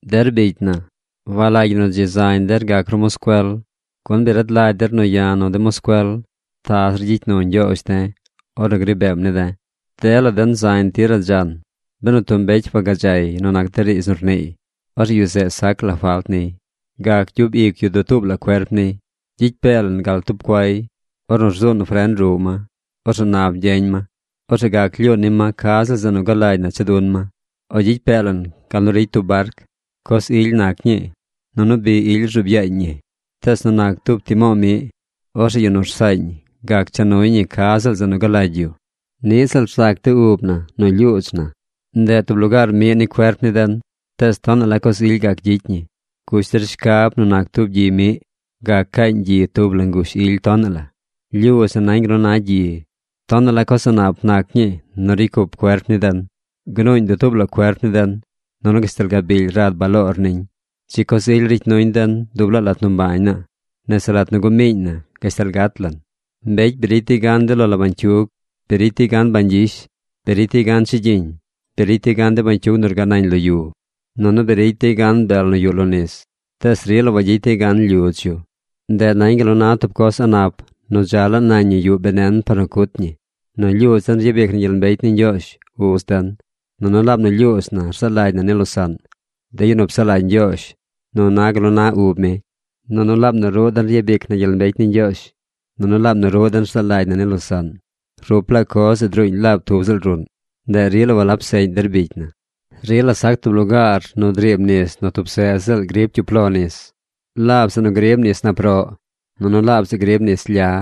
Der bicy na, walagy ñi nu dzi zañ der gac ru moscuel, gun bi rad lagy der nu ya̱ nu de moscuel ta zir gyicy nu Ñgyoozh de̱ ornu gri beem ne̱ de̱. Dela den zañ tir radzan. Benu tub mbecy wagadzay nu nac de riidz nu rniiy, orzeꞌ yu zeꞌ sac la falt niy. Gac gyub ic yu dutuub la cuerp niy. Gyicy pee lan gal tub cuay, ornu zuun fren ruꞌ ma. Orzeꞌ nap gyeñ ma. Orzeꞌ gac lyuun ni ma ca ziꞌl zeꞌ nu galagy na cha dun ma. O gyicy pee lan gal nu ricy tub barc. Coz ily nac ñii, nunu bi ily rzuub yaañ ñi. Tees nu nac tub timo̱o̱ miꞌ, orzeꞌ yu nu rsaañ gac cha nuy ñi ca ziꞌl zeꞌ nu galagy yu. Niꞌ ziꞌl rzac de ub na nu lyuudz na. Ndeꞌ tub lugaar miꞌ ni cuerp ni den, tees tonaꞌ la coz ily gac gyicy ñi. Gush der shcab nu nac tub gyi miꞌ. Gac caañ gyi tub la ngush ily tonaꞌ la. Lyudz na nañ gal nu na gyi. Tonaꞌ la coz a̱ꞌ nap nac ñii nu ricy cup cuerp ni den. Gnuuñ dutuub la cuerp ni den. Nunu gashtal gabily rad baloor niñ. Dzi coz ily ricy nuñ den dub laa lat nu mbañ naa: nese lat nu gumiiñ na gashtal gat lan. Mbecy bi ricy dey gan de lo la bañcyug. Bi ricy dey gan bañ gyish. Bi ricy dey gan chigyiñ. Bi ricy dey gan de bañcyug nu rgaꞌ nañ lo yu. Nunu bi ricy dey gan bel nu yuꞌ lo nis. Tees rila wagyicy dey gan lyudz yu. Ndeꞌ nañ gal nu na tub coz a̱ꞌ nap nu dza laa nañ ñi yuꞌ benen par nu cut ñi. Nu lyudz den ryabic na gyel mbecy ni Ñgyoozh, Uz den. Nunu laab nu lyuudz na rzaa lagy na ni losaꞌn, de yu nu psaꞌ lagy Ñgyoozh nu na gal nu na ub mi. Nunu laab nu ruꞌ den ryabic na gyel mbecy ni Ñgyoozh. Nunu laab nu ruꞌ den rzaa lagy na ni losaꞌn. Rup laa coz zeꞌ druuñ laab tub ziꞌl ruꞌn. Ndeꞌ rila walab seꞌñ der bicy na. Rila sac tub lugaar nu driib nis nu tub seꞌ ziꞌl grib cyup lo nis: laab zeꞌ nu grib nis ish, nunu laab zeꞌ grib nis lya.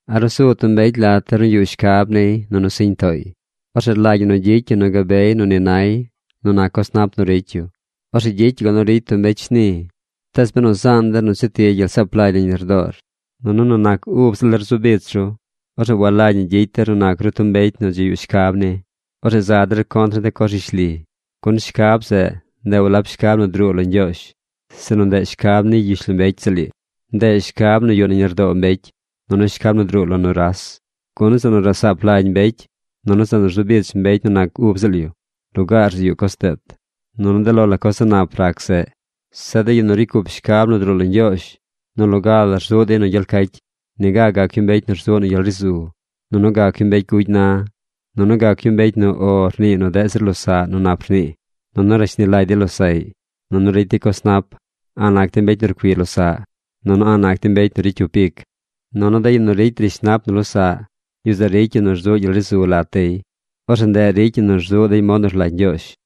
¿A ruu su tub mbecy lat der nu yuꞌ shcab niy nunu siñ tooy? Orzeꞌ rlagy ñi nu gyicy yu nu gabey nu ni nay nu nac de coz nap nu ricy yu. Orzeꞌ gyicy yu gal nu ricy tub mbecy shni. Tees benu zaan der nu cheti gyel saap lagy nañ lardoor, nunu benu nu nac ub ziꞌl der zu bich ru, orzeꞌ walagy ñi gyicy der nu nac ru tub mbecy nu dzi yuꞌ shcab ni. Orzeꞌ za der contr ni de coz rishli. Gun shcab zeꞌ, ndeꞌ walab shcab nu druu lo Ñgyoozh, sinu ndeꞌ shcab ni gyishlombecy ziꞌl ii. Ndeꞌ shcab nu yuꞌ nañ lardoo mbecy, nunu shcab nu druu lo nuras. Gun zeꞌ nu rasaap lagy mbecy, nunu zeꞌ nu rzu bich mbecy nu nac ub ziꞌl yu, lugaar zeꞌ yuꞌ coz deet. Nunu de lo la coz a̱ꞌ nap rac zeꞌ. Zeꞌ de yu nu ricy cup shcab nu druu lo Ñgyoozh nu loga la rzuꞌ dey nu gyel cacy. Niga gac yu mbecy nu rzuꞌ nu gyel ri zu. Nunu gac yu mbecy gugy na. Nunu gac yu mbecy nu “O” rnii nu deꞌ zir losaꞌ nu nap rnii. Nunu rashni lagy dey losaꞌy. Nunu ricy dey coz nap. A̱ꞌ nac dey mbecy nu rcui losaꞌ. Nunu a̱ꞌ nac dey mbecy nu ricy cyup ic. Nunu de yu nu ricy rishnap nu losaꞌ, yu zeꞌ ricy yu nu rzuꞌ gyel ri zu lat dey. Orzeꞌ ndeꞌ ricy ñi nu rzuꞌ dey mod nu rlagy Ñgyoozh.